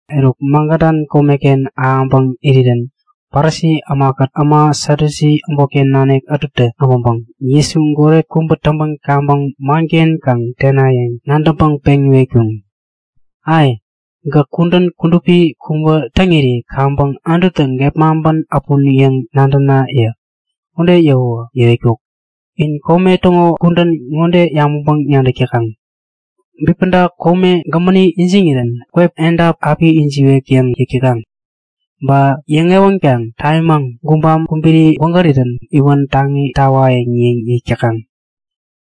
Eruk Magadan komeken ahäŋpäŋ irirän Parisi ämakät äma Satyusi äbotken nanik ätutä äbäŋpäŋ Jesutä goret kubä täŋpän kaŋpäŋ manken kaŋ tenayäŋ nadäŋpäŋ peŋ iwetkuŋ; Ai! Gäk kudän kudupi kubä täŋiri kaŋpäŋ Anututä gepmaŋpän äpun yäŋ nadäna! yäk. Ude yäwäwä yäwetkuk; In kome täŋo kudän ŋode yabäŋpäŋ-nadäk täkaŋ; Bipäda kome gämäni ijiŋirän kwep edap api ijiwek yäŋ yäk täkaŋ. Ba yäŋewänkaŋ tamimaŋ gubam kubiri gwägärirän iwän taŋi tawayäŋ yäŋ yäk täkaŋ.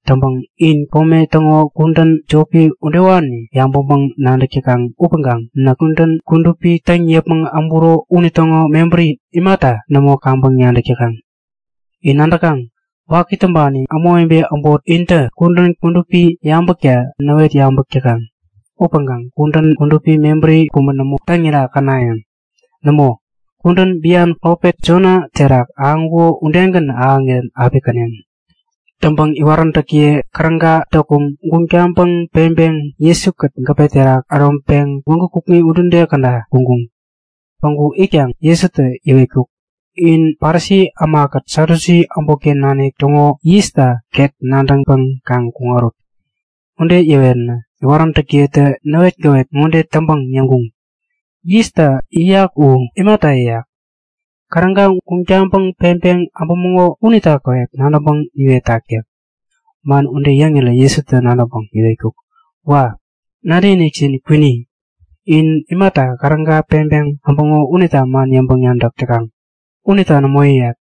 Täŋpäŋ in kome täŋo kudän jopi udewani yabäŋpäŋ-nadäk täkaŋ upäŋkaŋ näk kudän kudupi täŋ yäpmäŋ äburo unitäŋo mebäri imata nämo kaŋpäŋ nadäk täkaŋ? In nadäkaŋ? Waki täŋpani ämawebe äbot intä kudän kudupi yabäkta näwet yabäk täkaŋ. Upäŋkaŋ kudän kudupi mebäri kubä nämo täŋira känayäŋ! Nämo, kudän bian profet Jona terak ahäŋkuko udegän ahäŋirän api käneŋ. Täŋpäŋ iwaräntäkiye käräga däkum guŋ taŋpäŋ peŋpeŋ Jesu-kät gäpe terak äroŋpeŋ gwägu kukŋi udude käda kuŋkuŋ. Päŋku itkaŋ Jesutä yäwetkuk; In Parisi ämakät Satyusi äbotken nanik täŋo yista ket nadäŋpäŋ kaŋ kuŋarut! Ude yäwänä iwaräntäkiyetä näwetgäwet ŋode täŋpäŋ yäŋkuŋ; Yista yäyak u imata yäyak? Käräga guŋ taŋpäŋ peŋpeŋ äbämäŋo unita käwep nadäŋpäŋ niwetak yäk. Man ude yäŋirä Jesutä nadäŋpäŋ yäwetkuk; Wa! Nadäkinikjin kwini. In imata käräga peŋpeŋ äbäŋo unita man yäŋpäŋ-nadäk täkaŋ? Unita nämo yäyat.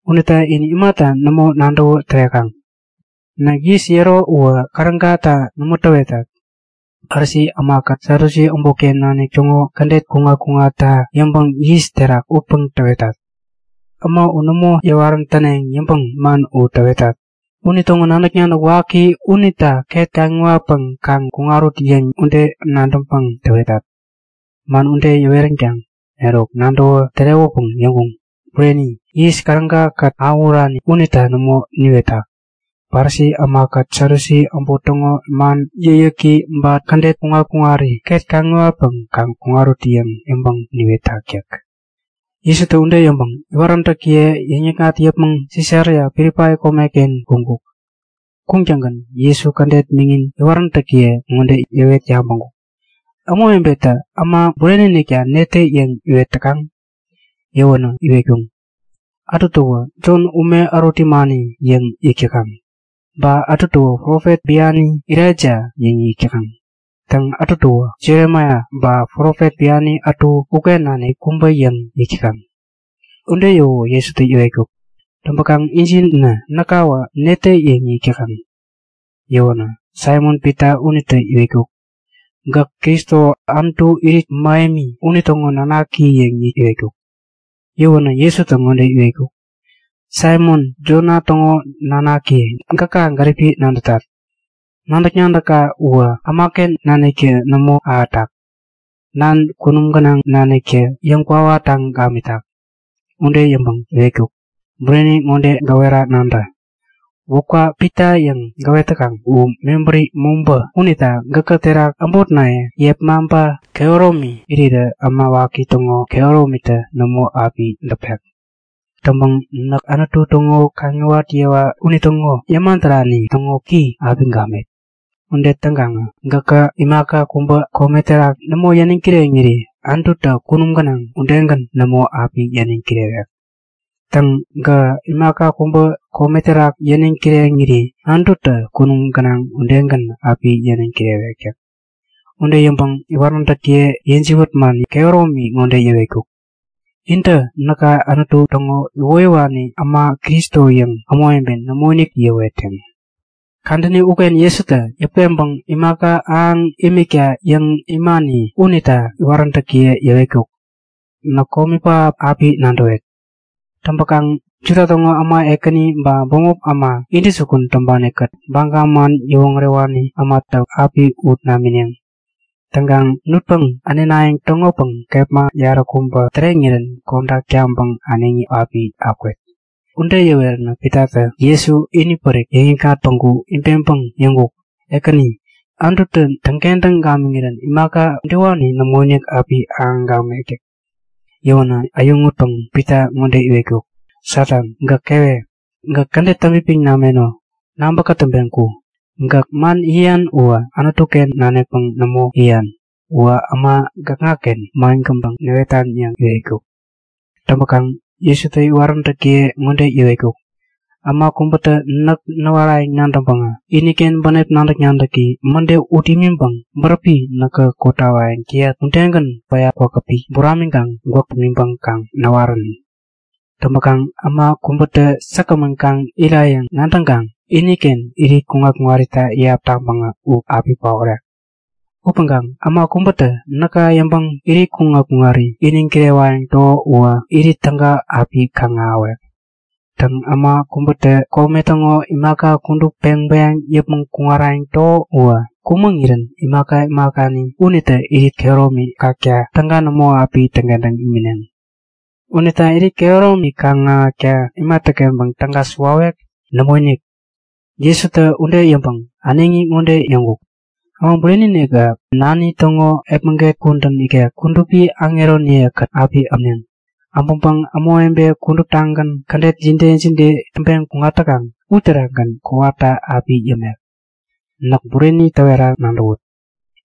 Unita in imata nämo nadäwä tärekaŋ? Näk yis yäro uwä kärägata nämo täwetat. Parisi ämakät Satyusi äbotken nanik täŋo kädet kuŋat-kuŋatta yäŋpäŋ yis terak utpäŋ täwetat. Äma u nämo yäwarän täneŋ yäŋpäŋ man u täwetat. Unitäŋo nadäk-nadäk waki unita ket kaŋiwatpäŋ kaŋ kuŋarut yäŋ ude nadäŋpäŋ täwetat. Man ude yäweränkaŋ eruk nadäwä tärewäpäŋ yäŋkuŋ; Bureni! Yis, käräga-kät awähurani unita nämo niwetak. Parisi ämakät Satyusi äbot täŋo man yäkyäki ba kädet kuŋat-kuŋarita ket kaŋiwatpäŋ kaŋ kuŋarut yäŋ yäŋpäŋ niwetak yäk. Jesutä ude yäŋpäŋ iwaräntäkiye yäŋ-yäkŋat yäpmäŋ Sisaria Pilipai komeken kuŋkuk. Kuŋtäŋgän Jesutä kädet miŋin iwaräntäkiye ŋode yäwet yabäŋkuk; Ämawebetä Äma Bureni-inikta netä yäŋ iwet täkaŋ? Yäwänä iwetkuŋ; Ätutäwä Jon, ume ärut yämani yäŋ yäk täkaŋ. Ba ätutäwä profet biani Elaija yäŋ yäk täkaŋ. Täŋ, ätutäwä Jeremaia ba profet biani ätu uken nanik kubä yäŋ yäk täkaŋ yäk. Ude yäwäwä Jesutä yäwetkuk; Täŋpäkaŋ injinä näkawä netä yäŋ yäk täkaŋ? Yäwänä Saimon-Pita unitä iwetkuk; Gäk Kristo, Anutu Irit Mähemi unitäŋo nanaki yäŋ iwetkuk. Yäwänä Jesutä ŋode iwetkuk; Saimon, Jona täŋo nanaki, gäka gäripi nadätat! Nadäk-nadäkka uwä ämaken naniktä nämo ahätak. Nana kunum gänaŋ naniktä yäŋkwawa täŋ gamitak. Ude yäŋpäŋ iwetkuk; Bureni ŋode gäwera nadä; Wäpka Pita yäŋ gäwet täkaŋ u mebäri mobä unita gäkä terak äbotnaye yepmaŋpa kehäromi irirä äma waki täŋo kehäromitä nämo api däpek. Täŋpäŋ näk Anutu täŋo kaŋiwat yewa unitäŋo yäma därani täŋo ki api gamet. Ude täŋkaŋä gäkä imaka kubä kome terak nämo yäniŋ kireŋiri Anututä kunum gänaŋ udegän nämo api yäniŋ kirewek. Täŋ, gäkä imaka kubä kome terak yäniŋ kireŋiri Anututä kunum gänaŋ udegän api yäniŋ kirewek yäk. Ude yäŋpäŋ iwaräntäkiye yäjiwät man kehäromi ŋode yäwetkuk; Intä näka Anutu täŋo iwoyäwani äma Kristo yäŋ ämawebe nämoinik yäwetneŋ. Kadäni uken Jesutä yäput peŋpäŋ imaka ahäŋ imikta yäŋ imani unita iwaräntäkiye yäwetkuk; Näk komi pähap api nadäwet. Täŋpäkaŋ Juda täŋo äma ekäni ba bämop äma intäjukun täŋpani-kät Baga man yäwoŋärewani ämatä mäde api ut namineŋ. Täŋkaŋ nutpäŋ änenayäŋ täŋopäŋ kepma yaräkubä täreŋirän kodak taŋpäŋ äneŋi api akwet. Ude yäweränä Pitatä Jesu inipärik yäŋikŋat päŋku ibeŋpäŋ yäŋkuk; Ekäni, Anututä täŋkentäŋ gamiŋirän imaka udewani nämoinik api ahäŋ gamek yäk. Yäwänä äyäŋutpäŋ Pita ŋode iwetkuk; Satan, gäk kewe! Gäk kädet täŋpipiŋ nameno! Nabä kätäŋpeŋ ku! Gäk man yäyan uwä Anutu-ken nanikpäŋ nämo yäyan. Uwä äma gäkŋaken mangänpäŋ näwetan yäŋ iwetkuk. Täŋpäkaŋ Jesutä iwaräntäkiye ŋode yäwetkuk; Äma kubätä näk näwarayäŋ nadäŋpäŋä iniken bänep nadäk-nadäki mäde ut imiŋpäŋ bäräpi näkä kotawayäŋ täyat udegän päya kwakäpi buramiŋkaŋ gwäk pimiŋpäŋ kaŋ näwarän. Täŋpäkaŋ, äma kubätä säkgämän kaŋ irayäŋ nadäŋkaŋ iniken irit kuŋat-kuŋarita iyap taŋpäŋä u api paorek. Upäŋkaŋ äma kubätä näka yäŋpäŋ irit kuŋat-kuŋari iniŋ kirewayäŋ täko uwä irit täga api kaŋ-ahäwek. Täŋ, äma kubätä kome täŋo imaka kudup peŋ bäyaŋpäŋ yäpmäŋ kuŋarayäŋ täko uwä kumäŋirän imaka imakani unitä irit kehäromi kakta täga nämo api täŋkentäŋ imineŋ. Unita irit kehäromi kaŋ-ahäkta imatäkenpäŋ täga suwawek? Nämoinik! Jesutä ude yäŋpäŋ äneŋi ŋode yäŋkuk; Äma Bureni-inikä nani täŋo epmäget kudän ikek kudupi aŋeroniye-kät api äpneŋ. Äpäŋpäŋ ämawebe kuduptagän kädet jide jide täŋpeŋ kuŋat täkaŋ uterakgän kowata api yämek. Näk bureni täwera nadäwut;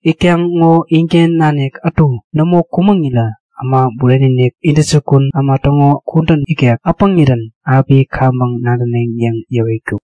Itkaŋ ŋo inken nanik ätu nämo kumäŋirä Äma Bureni-inik intäjukun äma täŋo kudän ikek äpäŋirän api kaŋpäŋ nadäneŋ yäŋ yäwetkuk.